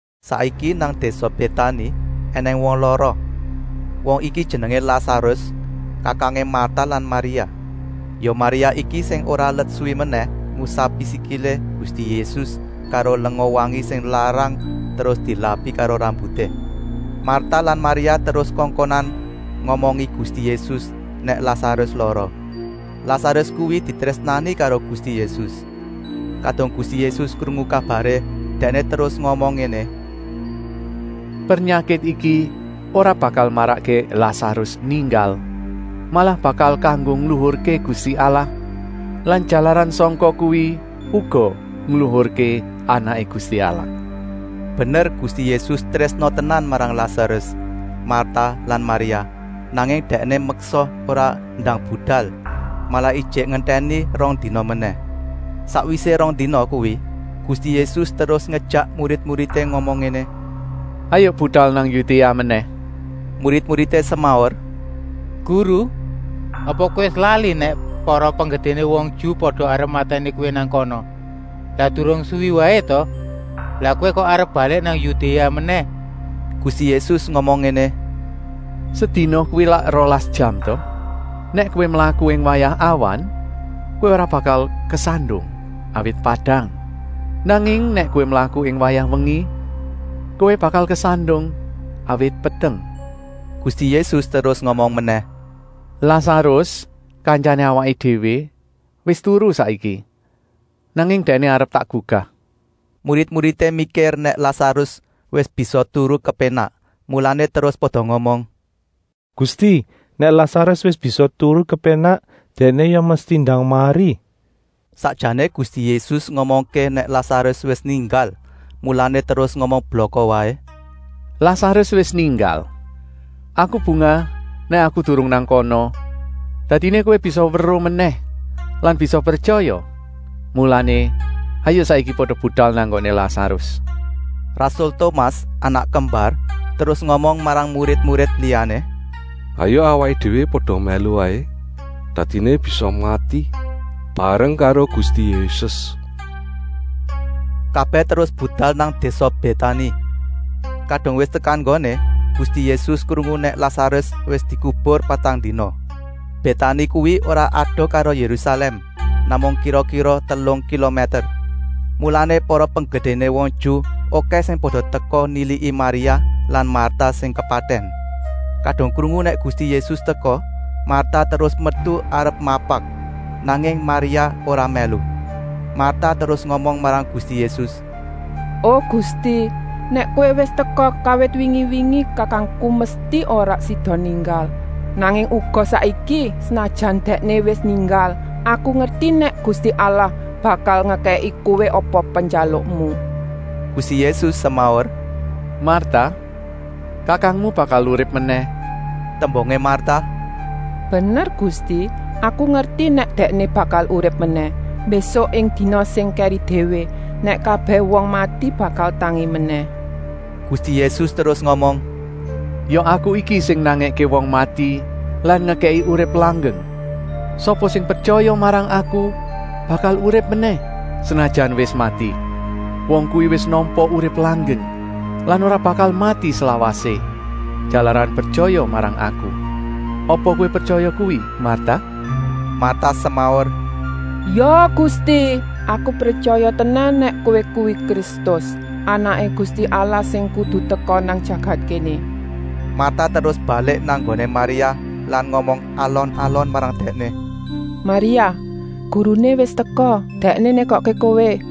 Saiki nang désa Bétani ènèng wong lara. Wong iki jenengé Lasarus, kakangé Marta lan Maria. Ya Maria iki sing ora let suwi menèh ngusapi sikilé Gusti Yésus karo lenga wangi sing larang terus dilapi karo rambuté. Marta lan Maria terus kongkonan ngomongi Gusti Yésus nèk Lasarus lara. Lasarus kuwi ditrésnani karo Gusti Yésus. Kadung Gusti Yésus krungu kabaré, Dèkné terus ngomong ngéné: “Pernyakit iki ora bakal marakké Lasarus ninggal, malah bakal kanggo ngluhurké Gusti Allah lan jalaran sangka kuwi uga ngluhurké Anaké Gusti Allah.” Bener Gusti Yésus trésna tenan marang Lasarus, Marta lan Maria, nanging Dèkné meksa ora ndang budal, malah ijik ngentèni rong dina menèh. Sakwisé rong dina kuwi Gusti Yésus terus ngejèk murid-muridé ngomong ngéné: “Hayuk budal nang Yudéa menèh!” Murid-muridé semaur: “Guru, apa Kowé wis lali nèk para penggedéné wong Ju pada arep matèni kowé nang kana. Lak durung suwi waé ta? Lah Kowé kok arep balik nang Yudéa menèh?” Gusti Yésus ngomong ngéné: “Sedina kuwi lak rolas jam ta. Nèk kowé mlaku ing wayah awan kowé ora bakal kesandung, awit padang. Nanging nèk kowé mlaku ing wayah wengi, kowé bakal kesandung, awit peteng.” Gusti Yésus terus ngomong menèh: “Lasarus, kantyané awaké déwé, wis turu saiki, nanging dèkné arep tak gugah.” Murid-muridé mikir nèk Lasarus wis bisa turu kepénak, mulané terus pada ngomong: “Gusti, nèk Lasarus wis bisa turu kepénak, dèkné ya mesti ndang mari.” Sakjané Gusti Yésus ngomongké nèk Lasarus wis ninggal, mulané terus ngomong blaka waé: “Lasarus wis ninggal! Aku bungah nèk Aku durung nang kana, dadiné kowé bisa weruh menèh lan bisa pretyaya. Mulané hayuk saiki pada budal nang nggoné Lasarus.” Rasul Tomas, anak kembar, terus ngomong marang murid-murid liyané: “Hayuk awaké déwé pada mèlu waé, dadiné bisa mati bareng karo Gusti Yésus.” Kabèh terus budal nang désa Bétani. Kadung wis tekan nggoné, Gusti Yésus krungu nèk Lasarus wis dikubur patang dina. Bétani kuwi ora adoh karo Yérusalèm, namung kira-kira telung kilomèter. Mulané para penggedéné wong Ju okèh sing pada teka niliki Maria lan Marta sing kepatèn. Kadung krungu nèk Gusti Yésus teka, Marta terus metu arep mapak, nanging Maria ora mèlu. Marta terus ngomong marang Gusti Yésus: “O Gusti, nèk Kowé wis teka kawit wingi-wingi kakangku mesti ora sida ninggal. Nanging uga saiki, senajan dèkné wis ninggal, aku ngerti nèk Gusti Allah bakal ngekèki Kowé apa penjalukmu.” Gusti Yésus semaur: “Marta, kakangmu bakal urip menèh.” Tembungé Marta: “Bener Gusti, aku ngerti nèk dèkné bakal urip menèh, mbésuk ing dina sing kèri déwé, nèk kabèh wong mati bakal tangi menèh!” Gusti Yésus terus ngomong: “Ya Aku iki sing nangèké wong mati lan ngekèki urip langgeng. Sapa sing pretyaya marang Aku bakal urip menèh, senajan wis mati. Wong kuwi wis nampa urip langgeng lan ora bakal mati slawasé, jalaran pretyaya marang Aku. Apa kowé pretyaya kuwi, Marta?” Marta semaur: “Ya Gusti, aku pretyaya tenan nèk Kowé kuwi Kristus, Anaké Gusti Allah sing kudu teka nang jagat kéné.” Marta terus balik nang nggoné Maria lan ngomong alon-alon marang dèkné: “Maria, Guruné wis teka. Dèkné nékokké kowé!”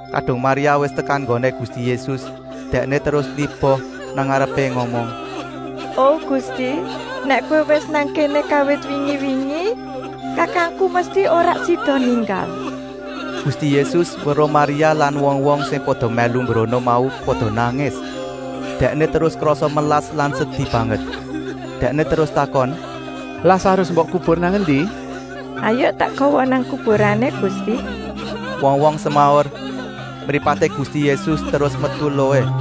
Kadung Maria wis tekan nggoné Gusti Yésus, dèkné terus niba nang ngarepé ngomong: “O Gusti, nèk Kowé wis nang kéné kawit wingi-wingi, kakangku mesti ora sida ninggal.” Gusti Yésus weruh Maria lan wong-wong sing pada mèlu mbrono mau pada nangis, Dèkné terus krasa melas lan sedi banget. Dèkné terus takon: “Lasarus mbok kubur nang endi?” “Hayuk tak gawa nang kuburané, Gusti,” wong-wong semaur. Mripaté Gusti Yésus terus metu eluhé.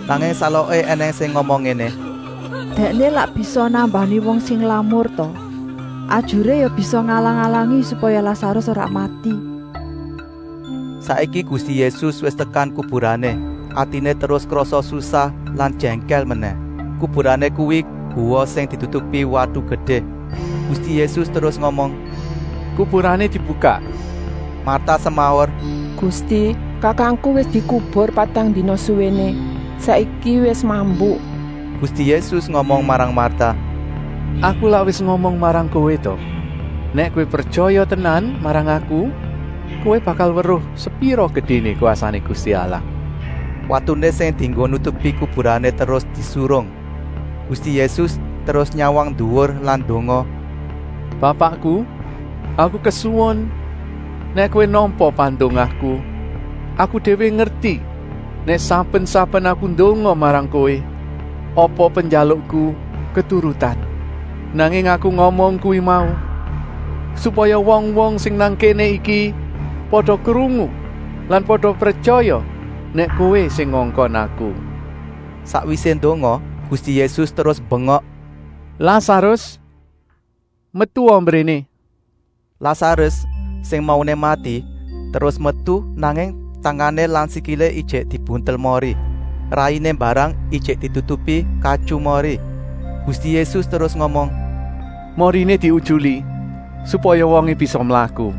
Nanging saloké ènèng sing ngomong ngéné: “Dèkné lak bisa nambani wong sing lamur ta! Ajuré ya bisa ngalang-alangi supaya Lasarus ora mati.” Saiki Gusti Yésus wis tekan kuburané, atiné terus krasa susah lan jèngkèl menèh. Kuburané kuwi guwa sing ditutupi watu gedé. Gusti Yésus terus ngomong: “Kuburané dibukak!” Marta semaur: “Gusti, kakangku wis dikubur patang dina suwéné. Saiki wis mambu!” Gusti Yésus ngomong marang Marta: “Aku lak wis ngomong marang kowé ta! Nèk kowé pretyaya tenan marang Aku, kowé bakal weruh sepira gedéné kwasané Gusti Allah!” Watuné sing dienggo nutupi kuburané terus disurung. Gusti Yésus terus nyawang nduwur lan ndonga: “Bapakku, Aku kesuwun nèk Kowé nampa pandongaku. Aku déwé ngerti nèk saben-saben Aku ndonga marang Kowé, apa penjalukku keturutan. Nanging Aku ngomong kuwi mau, supaya wong-wong sing nang kéné iki pada krungu lan pada pretyaya nèk Kowé sing ngongkon Aku.” Sakwisé ndonga, Gusti Yésus terus mbengok: “Lasarus, metua mbréné!” Lasarus, sing mauné mati, terus metu, nanging tangané lan sikilé ijik dibuntel mori. Rainé mbarang ijik ditutupi katyu mori. Gusti Yésus terus ngomong: “Moriné diutyuli supaya wongé bisa mlaku.”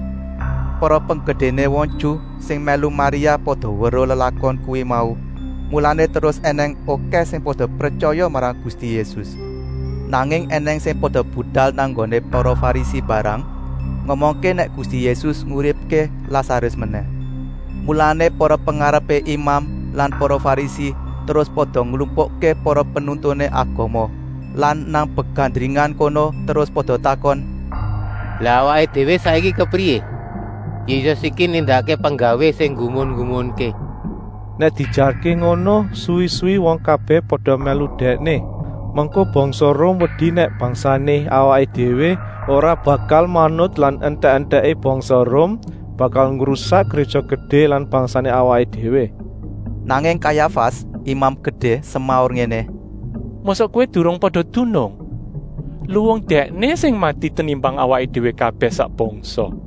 Para penggedéné wong Ju sing mèlu Maria pada weruh lelakon kuwi mau, mulané terus ènèng okèh sing pada pretyaya marang Gusti Yésus. Nanging ènèng sing pada budal nang nggoné para Farisi mbarang ngomongké nèk Gusti Yésus nguripké Lasarus menèh. Mulané para pengarepé imam lan para Farisi terus pada nglumpukké para penuntuné agama lan nang begandringan kono terus pada takon: “Lah awaké déwé saiki kepriyé? Yésus iki nindakké penggawé sing nggumun-nggumunké. Nèk diejarké ngono suwi-suwi wong kabèh pada mèlu Dèkné. Mengko bangsa Rum wedi nèk bangsané awaké déwé ora bakal manut lan entèk-entèké bangsa Rum bakal ngrusak Gréja Gedé lan bangsané awaké déwé.” Nanging Kayafas, Imam Gedé, semaur ngéné: “Mosok kowé durung pada dunung? Luwung Dèkné sing mati tenimbang awaké déwé kabèh sak bangsa.”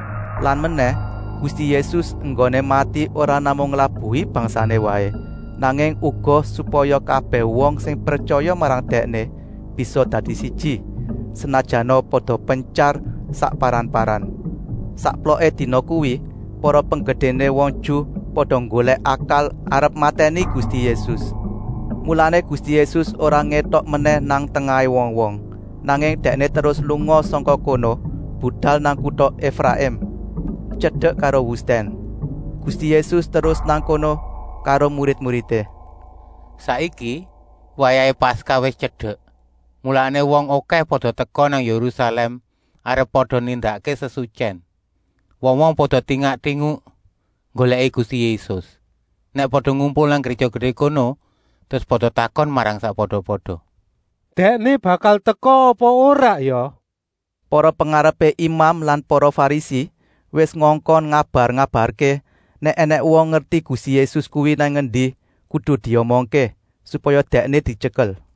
Lan menèh, Gusti Yésus enggoné mati ora namung nglabuhi bangsané waé, nanging uga supaya kabèh wong sing pretyaya marang Dèkné bisa dadi siji, senajana pada pentyar sakparan-paran. Sakploké dina kuwi para penggedéné wong Ju pada nggolèk akal arep matèni Gusti Yésus. Mulané Gusti Yésus ora ngétok menèh nang tengahé wong-wong, nanging Dèkné terus lunga sangka kono budal nang kuta Efraim, tyedek karo wustèn. Gusti Yésus terus nang kono karo murid-muridé. Saiki wayahé Paskah wis tyedek, mulané wong okèh pada teka nang Yérusalèm arep pada nindakké sesutyèn. Wong-wong pada lingak-linguk nggolèki Gusti Yésus. Nèk pada ngumpul nang Gréja Gedé kono terus pada takon marang sakpada-pada: “Dèkné bakal teka apa ora ya?” Para pengarepé imam lan para Farisi wis ngongkon ngabar-ngabarké, nèk ènèng wong ngerti Gusti Yésus kuwi nang endi, kudu diomongké, supaya Dèkné dityekel.